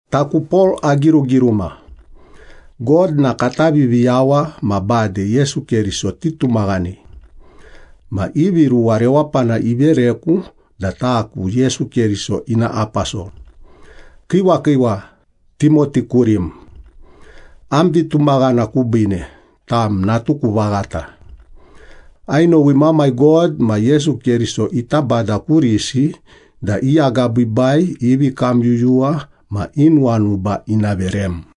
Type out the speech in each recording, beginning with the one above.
Taku Pol agirugiruma. God na kata Viviyawa ma bade Yesu Keriso titumaghanei. Ma ivi ruwa rewapana ivereku da taku Yesu Keriso ina aposol. Kiiwa kiiwa, Timoti kurim. Am vitumaghana kubiine, tam natuku vaghata. Ainowi Mamai God ma Yesu Keriso ita Bada kurisi da i agabiibai, i vikamyuyuwa ma i nuwanuba ina verem.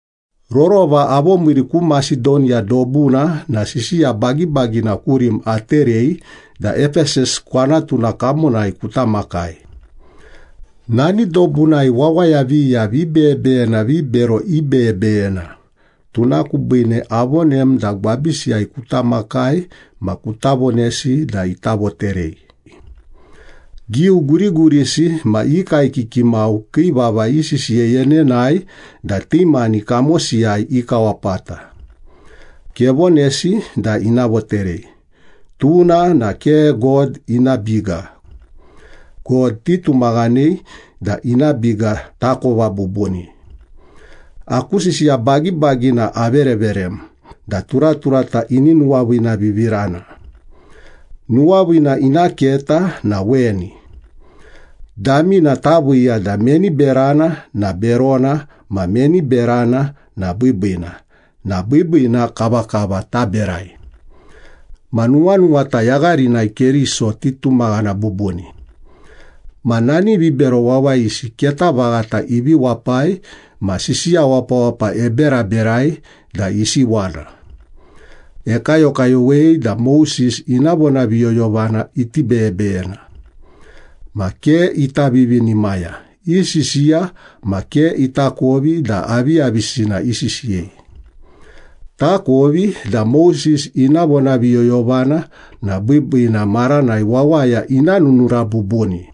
Rorova avomiiri ku Masedoniya dobuna na sisiya bagibagina kurim aterei da Epesas kwanatuna kamonai kuta makai. Nani dobunai wawaya viya vibeyebeyena vibero ibeyebeyena, tuna kubiine avonem da gwabisiyai kuta makai ma kuta vonesi da ita voterei. Giu gurigurisi ma i kaekiki mau kii vava isisiyei enenae da ti mani kamosiyai ikawapata. Kevonesi da ina voterei, tuna na ke God ina biga. God titumaghanei da ina biga takova bubuni. Aku sisiya bagibagina avereverem da turaturata ini nuwaviinavivirana. Nuwaviina ina keta na weni. Damina taviiya da meni berana na berona ma meni berana na biibiina na biibiina kavakava taberai. Ma nuwanuwata yagharinai Keriso titumaghana bubuni. Ma nani vibero wawayisi keta vaghata ivi wapai ma sisiya wapawapa eberaberai da isiwana. Ekayokayowei da Moses ina vonaviyoyovana iti beyebeyena. Ma ke ita vivinimaya, isisiya ma ke itakovi da aviyavisina isisiyei. Takovi da Moses ina vonaviyoyovana na biibiina maranai wawaya ina nunura bubuni.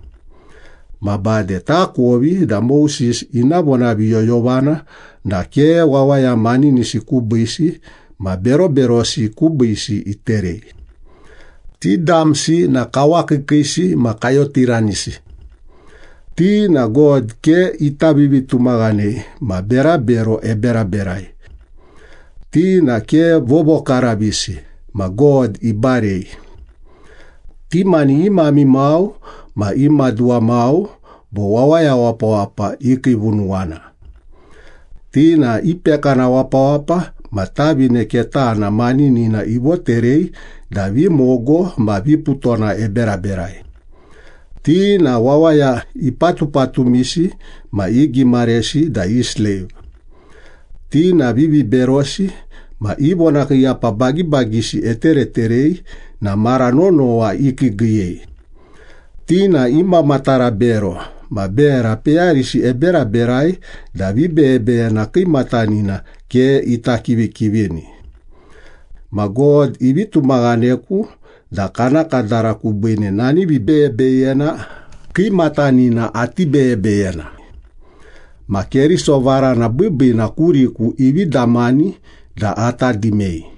Ma bade takovi da Moses ina vonaviyoyovana na ke wawaya maninisi kubiisi ma beroberosi kubiisi iterei. Ti damsi na kawakiikiisi ma kayotiranisi. Ti na God ke ita vivitumaghanei ma berabero eberaberai. Ti na ke vovokaravisi ma God ibarei. Ti mani i mamai mau ma i maduwa mau bo wawaya wapawapa ikiivunuwana. Ti na ipekana wapawapa ma tavine ketana maninina ivoterei da vimogo ma viputona eberaberai. Ti na wawaya ipatupatumisi ma igimaresi da i sleiv. Ti na viviberosi ma i vonakiiyapa bagibagisi etereterei na mara nonowa ikiigiiyei. Ti na imamatara bero, ma bera peyarisi eberaberai da vibeyebeyena kiimatanina ke ita kivikivini. Ma God ivi tumaghaneku da kana kadara kubiine nani vibeyebeyena kiimatanina ati beyebeyena. Ma Keriso varana biibiina kuriku ivi damani da ata dimei.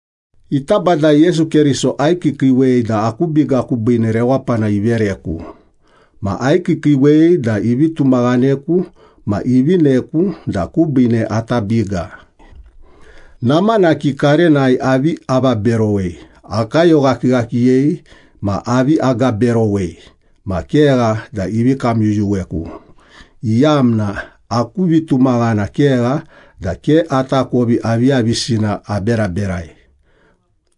Ita Bada Yesu Keriso aikiikiiwei da aku biga kubiine rewapana ivereku. Ma aikiikiiwei da ivi tumaghaneku ma ivineku da kubiine ata biga. Namanaki karenai avi avaberowei, akayoghakighakiyei, ma avi agaberowei, ma kegha da ivi kamyuyuweku, iyamna aku vitumaghana kegha da ke atakovi aviyavisina aberaberai.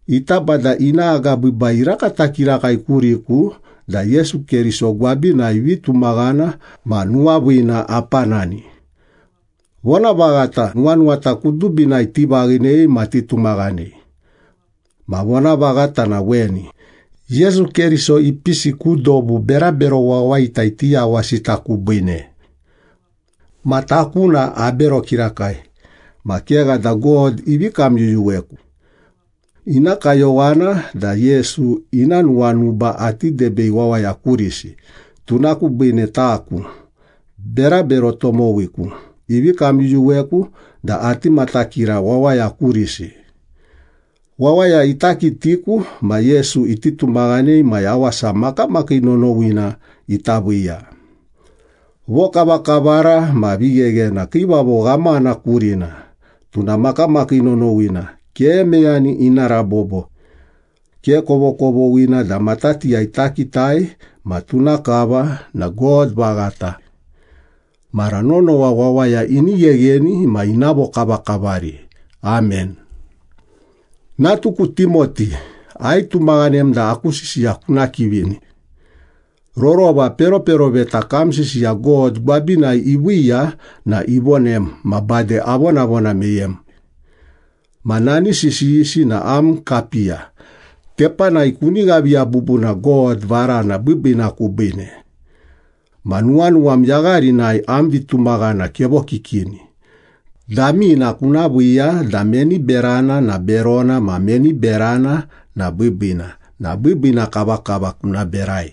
Ita Bada ina agabiibai irakata kirakai kuriku da Yesu Keriso gwabinai vitumaghana ma nuwaviina apanani. Vonavaghata nuwanuwata kudubinai tivaghinei ma titumaghanei. Ma vonavaghata na weni, Yesu Keriso ipisi ku dobu berabero wawayita iti yawasita kubiine. Ma taku na abero kirakai, ma kegha da God ivi kamyuyuweku. Ina kayowana da Yesu ina nuwanuba ati debei wawaya kurisi, tuna kubiine taku, berabero tomowiku, ivi kamyuyuweku da ati matakira wawaya kurisi. Wawaya ita kitiku ma Yesu iti tumaghanei ma yawasa makamakii nonowina ita viiya. Vokavakavara ma vigheghena Kiivavo Ghamana kurina. Tuna makamakii nonowina, ke meyani ina rabobo. Ke kovokovoghina da matatiyai takitai ma tuna kava na God vaghata. Mara nonowa wawaya ini ghegheni ma ina vokavakavari. Amen. Natuku Timoti, aitumaghanem da aku sisiya kuna kivini. Rorova peroperoveta kam sisiya God gwabinai iviiya na ivonem, ma bade avonavona meyem. Ma nani sisiyisi na am kapiya, tepanai kuni ghaviya bubuna God varana biibiina kubiine. Ma nuwanuwam yagharinai am vitumaghana kevokikini, damina kuna viiya da meni berana na berona ma meni berana na biibiina na biibiina kavakava kuna berai.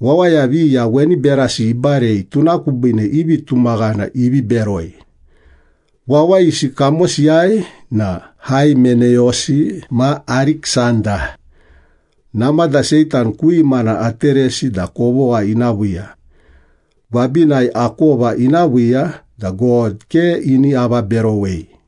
Wawaya viya weni berasi ibarei, tuna kubiine i vitumaghana ivi beroi. Wawayisi kamosiyai na Haimeneyosi ma Ariksanda. Namada Seitan ku imana ateresi da kovogha ina viiya. Gwabinai akova ina viiya da God ke ini avaberowei.